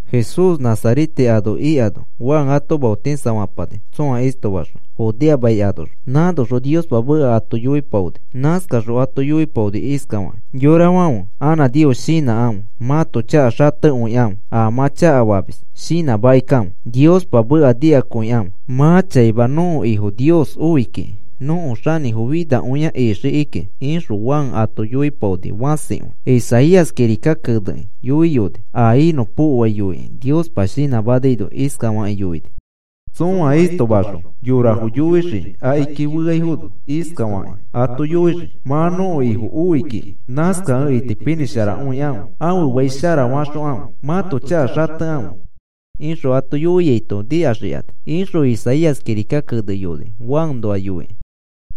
Jesús Nazarete ano ikano Juan ato maotisafapani tsõa istoma ixõ Judea mai anoxõ. Nãnoxõ Niospa meka ato yoipaoni. Nãnoxõ ato yoipaoni iskafakĩ: “Yorafãfe, anã Nios shinãkãfe. Mãto chaka xatekõikãfe, a mã chakafamis shinãmakikãfe. Niospa meka nikakõikãfe. Mã chaima nõko Ifo Nios oi kiki nõko xanĩfo finakõia ixii kiki,” ixõ Juan ato yoipaoni fãsikõi. Isaías kirika kenekĩ yoiyoni a inõpokoai yoikĩ Niospa shinãmanaino. Iskafakĩ yoini: Tsõa istoma anoxõ yorafo yoixii akiki feaifono. Iskafaki ato yoixii: “Mã nõko Ifo oi kiki. Nãskakẽ itipinĩsharakãfe. Ãfe fai sharafaxokãfe. Mãto chaka xatekãfe,” ixõ ato yoiaito nikaxikani, ixõ Isaías kirika keneyoni Juanoa yoikĩ.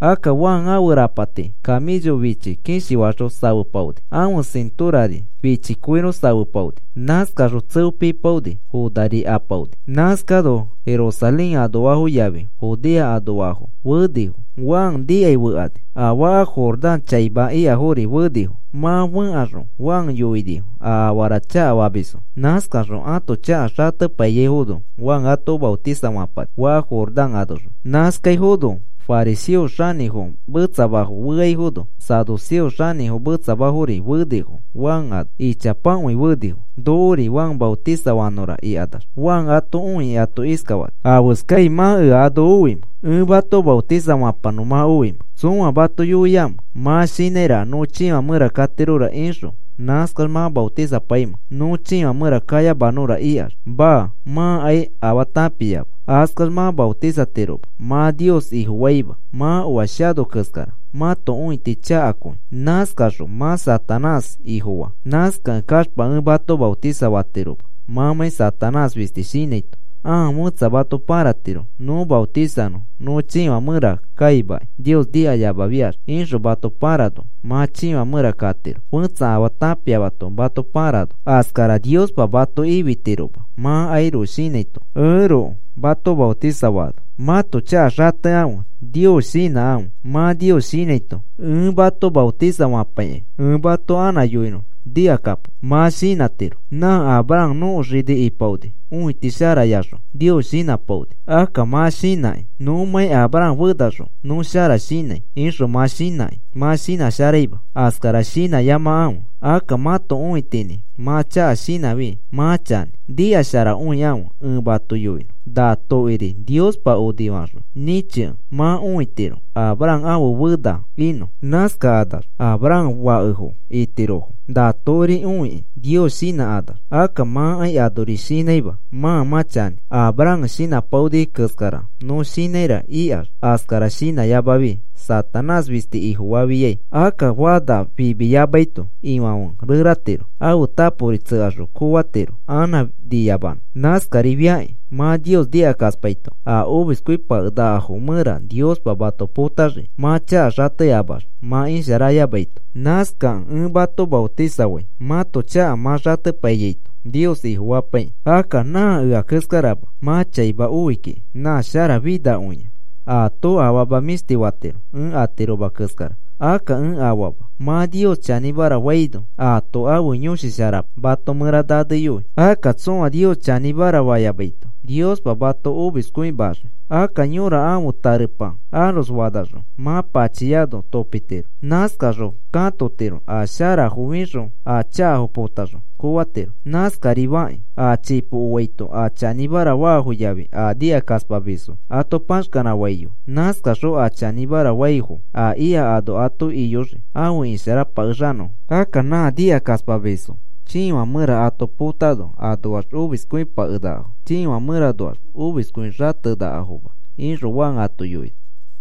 Akka Juan ãfe rapati kamĩcho fichi kishi faxõ safepaoni. Ãfe sĩtorari fichi koiro safepaoni. Nãskaxõ tseo pipaoni, fonari apaoni. Nãskano Jerusalén anoafo yafi Judea anoafo fenifo Juan nikai fekani. A faka Jordán chaima ikafori fenifo. Mã fẽkaxõ Juan yoinifo a afara chakafamisfo. Nãskaxõ ãto chaka xatepaiyaifono Juan ato maotisafapani faka Jordán anoxõ. Nãskaifono fariseofo xanĩfo metsamafo feaifono, saduceofo xanĩfo metsamafori fenifo Juan ano. Ichapakõi fenifo, “Nokori Juan nashimanõra,” ikanax. Juan ato õikĩ ato iskafani: “¿Afeskai mã ea ano oimẽ? ¿Ẽ mato maotisafapanõ mã oimẽ? ¿Tsõa mato yoiamẽ? Mã shinãiraka nõ chiifã mẽra katirora ixõ nãskax mã maotisapaimẽ, nõ chiifã mẽra kayamanõra ikax. Maa, mãkai afaa tãpiama, askax mã maotisatiroma. Mã Nios Ifofaima. Mã oa shano keskara mãto õiti chakakõi. Nãskaxõ mã Satanás ifofaa. Nãskakẽ kaxpa ẽ mato maotisafatiroma mãmãi Satanás fisti shinãito. Ãa fẽtsa mato pãratiro nõ maotisanõ nõ chiifã mẽra kaimakai Nios nikayamafiax ixõ mato pãrano mã chiifã mẽra katiro fetsa afaa tãpiamato mato pãrano. Askara Niospa mato ifitiroma mãkairoko shinãito, ẽroko mato maotisafaano. Mãto chaka xatekãfe, Nios shinãkãfe. Mã Nios shinãito ẽ mato maotisafapakai. Ẽ mato anã yoinõ nikakapo. Mã shinãtiro: ‘Nã Abraham nõko xini ipaoni, õiti sharayaxõ Nios shinãpaoni.’ Akka mã shinãkĩ: ‘Nõmãi Abraham fenaxõ nõ shara shinãi,’ ixõ mã shinãkĩ mã shinãsharaima. Askara shinãyamakãfe. Akka mãto õitinĩ mã chaka shinãfi mã chanĩ. Nikasharakõikãfe, ẽ mato yoinõ. Na tokiri Niospa onifaxõ nĩchikẽ mã õitiro Abraham ãfe fena inõ. Nãskakanax Abraham fakefo itirofo na tokiri õikĩ Nios shinãkanax. Akka mãkai anori shinãima mã mã chanĩ: ‘Abraham shinãpaoni keskara nõ shinãira,’ ikax. Askara shinãyamafi Satanás fisti ifofafiai. Akka fana fimiyamaito ifãfe reratiro. Ãfe tapori tsekaxõ koofatiro anã niyamanõ. Nãskarifakĩ mã Nios nikakaspaito a omiskõipakenakafo mẽra Niospa mato potaxii mã chaka xateaxma mã isharayamaito. Nãskakẽ ẽ mato maotisafai mãto chaka mã xatepaiyaito Nios Ifofapaikĩ. Akka nã ea keskarama mã chaima oi kiki, nã sharafinakõia. Aato afama mĩshti fatiro, ẽ atiroma keskara. Akka ẽ afaama. Mã Nios chanĩmara faino aato ãfe Yõshi Shara mato mẽra naneyoi. Akka tsõa Nios chanĩmara fayamaito, Niospa mato omiskõimaxii. Akka yõra ãfe tarepa aros fanaxõ mã pachiano topitiro. Nãskaxõ katotiro a sharafo fixõ a chakafo potaxõ koofatiro. Nãskarifakĩ a chipo oaito a chanĩmara faafo yafi a nikakaspamisfo ato paxkanãfaiyoi. Nãskaxõ a chanĩmara faifo a ika ano ato iyoxii afe isharapakexanõfo. Akka nã nikakaspamisfo chiifã mẽra ato potano anoax omiskõipakenakafo. Chiifã mẽranoax omiskõi xatenakafoma,” ixõ Juan ato yoini.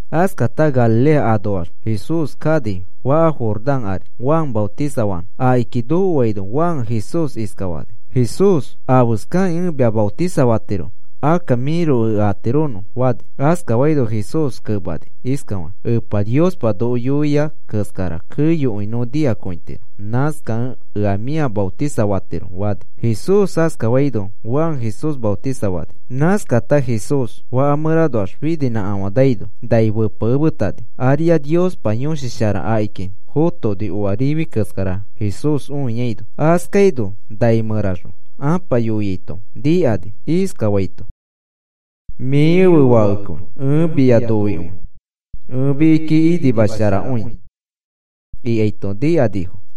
Askata Galilea anoax Jesús kani faka Jordán ari Juan maotisafanõ. Akiki nokoaino Juan Jesús iskafani: “Jesús, ¿afeskakĩ ẽ mia maotisafatiromẽ? Akka mĩroko ea atironõ,” fani. Askafaino Jesús kemani iskafakĩ: “Epa Niospa noko yoia keskara keyokõi nõ nikakõitiro. Nãskakẽ ea mĩa maotisafatiro,” fani. Jesús askafaino, Juan Jesús maotisafani. Nãskata Jesús faka mẽranoax fininãkafãnaino nai fepekemetani. Ariax Niospa Yõshi Shara akiki fotoni, oa rifi keskara Jesús õiaino. Askaino nai mẽraxõ Ãpa yoiaito nikani iskafaito: “Mĩ ẽfe Fakekõi ẽ mia noikõi. Ẽ mikiki inimasharakõi,” ikaito nikanifo.